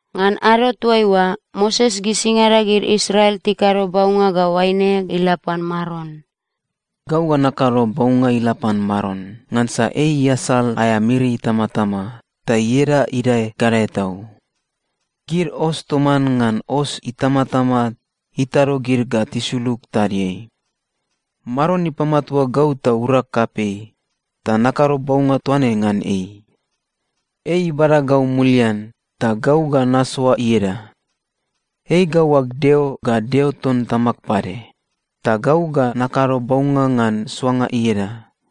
Ngan ado toaiua, Moses gisingada gid Israel tikado baunga ga oaine ila pan Maron. “Gau ga nakado baunga ila pan Maron, ngansa ei iasal aea miri itamatama, ta ieda idae gadae tau. Gid os toman ngan os itamatama, itado gid ga tisulug tadiai. Maron ipamatua gau ta urag kapei, ta nakado baunga toa ne ngan ei. Ei ibada gau mulian, ta gau ga nasoa ieda. Ei gau ag Deo ga Deo ton tamag pade, ta gau ga nakado baunga ngan soanga ieda.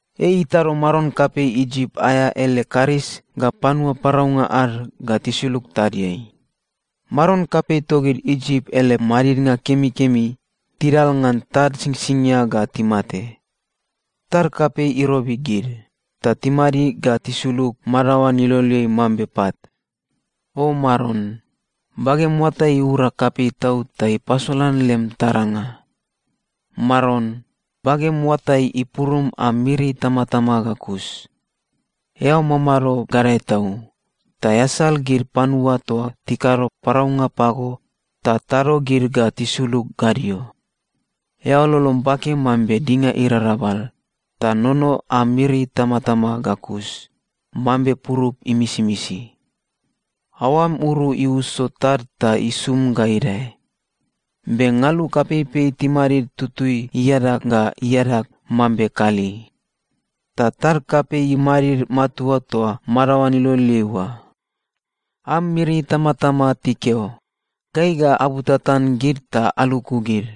Ei itado maron kapei Isip aea ele karis ga panua paraunga ad ga tisulug tadiai. Maron kapei togid Isip ele madidnga kemikemi tidal ngan tad Singsingia ga timate. Tad kapei irobi gid, ta timadi ga tisulug madaoan iloleai mambe pat. “O Maron, bagem oatai iura kapei tau ta ipasolan lem taranga. Maron, bagem oatai ipurum am miri itamatama ga kus. Eao mamado gadae tau ta easal gid panua toa tikado paraunga pago ta tado gid ga tisulug gadio. Eao lolom bake mambe dinga irarabal, ta nono am miri itamatama ga kus mambe purup imisimisi. Aoam uru iuso tad ta isum ga idae. Be ngalu kapeipei timadid tutui iadag ga iadag mambe kali. Ta tad kapei imadid matua toa madaoan iloleai oa. “Am miri itamatama tikeo, ‘Gai ga abutatan gid ta aluku gid.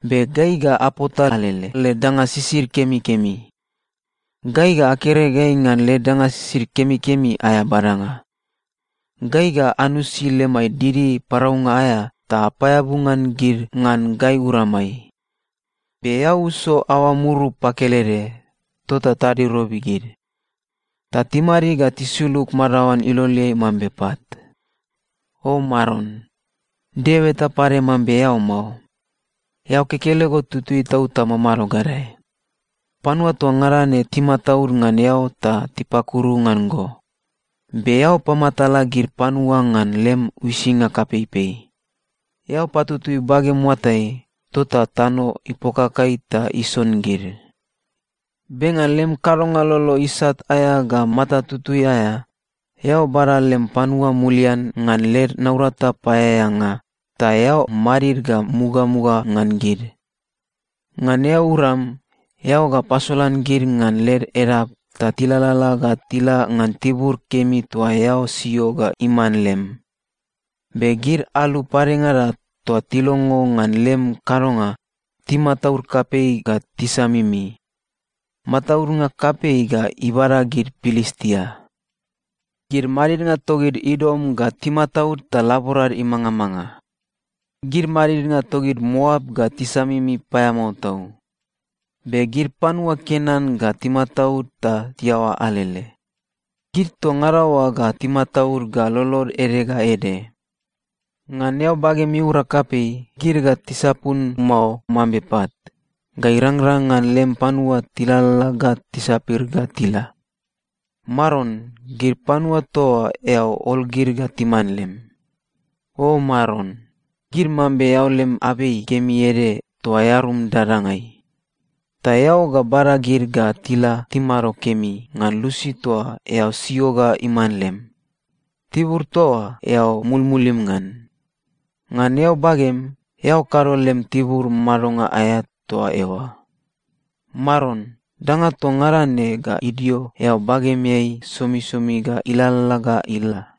Be gai ga apota alele led danga sisid kemikemi. Gai ga akere gai ngan led danga sisid kemikemi aea badanga. Gai ga anusi lemai didi paraunga aea ta apaeabu ngan gid ngan gai uramai.’ Be eao uso aoam uru pakelede, tota tad irobi gid. Ta timadi ga tisulug madaoan iloleai mambe pat. “O Maron, Deo eta pade mambe eao mao. Eao kekelego tutui tau ta mamado gadae. Panua toa ngada ne timataud ngan eao ta tipakuru ngan go, be eao pamatala gid panua ngan lem uisinga kapeipei. Eao patutui bagem oatai, tota tano ipokakai ta ison gid. “Be ngan lem kadonga lolo isat aea ga mata tutui aea, eao bada lem panua mulian ngan led naurata paeaeanga, ta eao madid ga mugamuga ngan gid. Ngan eao uram, eao ga pasolan gid ngan led edap, ta tilalala ga tila ngan tibur kemi toa eao sio ga iman lem. Be gid alu padengada toa tilongo ngan lem kadonga, timataud kapei ga tisamimi. Mataudnga kapei ga ibada gid Pilistia. Gid madidnga togid Idom ga timataud ta laborad imangamanga. Gid madidnga togid Moap ga tisamimi paeamao tau. Be gid panua Kenan ga timataud ta tiaoa alele. Gid toa ngada oa ga timataud ga lolod ede ga ede. Ngan eao bagem iura kapei, gid ga tisapun mao mambe pat, ga irangrang ngan lem panua tilalala ga tisapir ga tila. Maron, gid panua toa oa eao ol gid ga timan lem. O Maron, gid mambe eao lem abei kemi ede toa earum dadangai. Ta eao ga bada gid ga tila timado kemi ngan lusi toa eao sio ga iman lem. Tibur toa oa, eao mulmulim ngan. Ngan eao bagem eao kado lem tibur madonga aea toa eoa. Maron, danga toa ngada ne ga idio eao bagemeai somisomi ga ilalala ga ila.”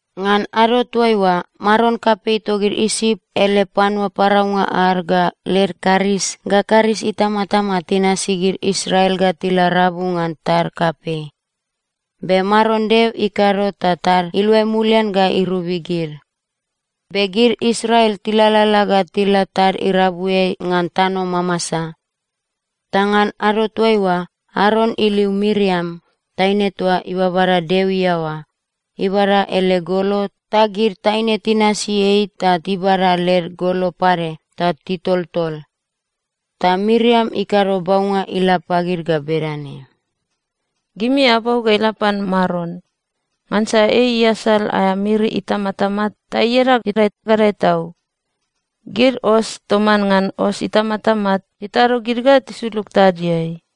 Ngan ado toaiua, maron kapei togid Isip ele panua paraunga ad ga led karis ga karis itamatama tinasi gid Israel ga tila rabu ngan tad kapei, be Maron Deo ikado ta tad iluai mulian ga irobi gid. Be gid Israel tilalala ga tila tad irabuiai ngan tano mamasa. Ta ngan ado toaiua, Aron iliu Miriam, taine toa ibabada Deo iaoa, ibada ele golo ta gid taine tinasi ei ta tibada led golo pade ta titoltol. Ta Miriam ikado baunga ila pagid ga bedane: “Gimi abau ga ila pan Maron, ngansa ei iasal aea miri itamatama, ta ieda idae gadae tau. Gid os toman ngan os itamatama, itado gid ga tisulug tadiai.”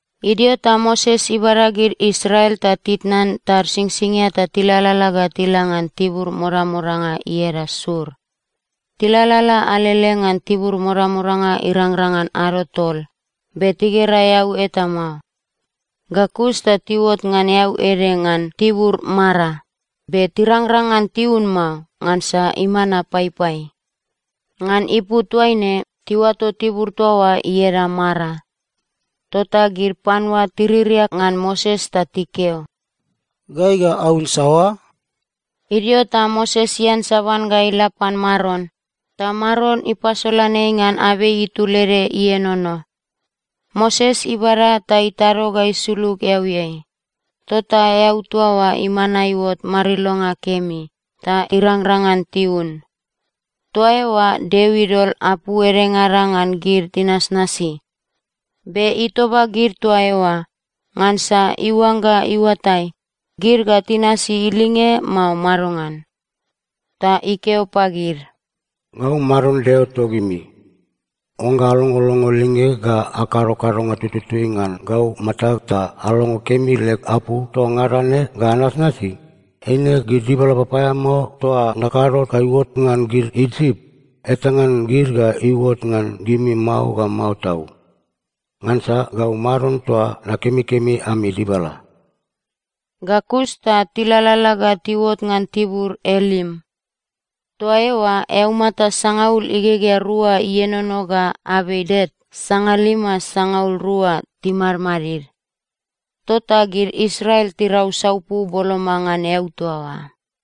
Idio ta Moses ibada gid Israel ta titnan tad Singsingia ta tilalala ga tila ngan tibur modamodanga ieda Sur. Tilalala alele ngan tibur modamodanga irangrang ngan ado tol, be tigera eau eta mao. Ga kus ta tiuot ngan eau ede ngan tibur Mara, be tirangrang ngan tiun mao, ngansa imana paipai. Ngan ipu toaine tiuato tibur toa oa ieda Mara. Tota gid panua tiririak ngan Moses ta tikeo, “Gai ga aun saoa?” Idio ta Moses iansaban ga ila pan Maron, ta Maron ipasolan ei ngan abei itul ede ienono. Moses ibada ta itado ga isulug eauiai. Tota eau toa oa imana iuot marilonga kemi, ta tirangrang ngan tiun. Toa eoa Deo idol apu edengada ngan gid tinasnasi, be itoba gid toa eoa, ngansa iuangga iuatai, gid ga tinasi ilinge, mao madongan? Ta ikeo pagid, “Gau Maron Deo togimi. Oangga alongolongo lingeg ga akado kadonga tututui ngan gau matag ta alongo kemi leg apu toa ngada ne ga anasnasi, eine gid dibala papaeamao toa nakado ga iuot ngan gid Isip, eta ngan gid ga iuot ngan gimi mao ga mao tau. Ngansa gau Maron toa nakemikemi ami dibala.” Ga kus ta tilalala ga tiuot ngan tibur Elim. Toa eoa eaumata sangaul igegea rua ienono ga abei det sangalima sangaul rua timadmadid. Tota gid Israel tirau saupu boloma ngan eau toa oa.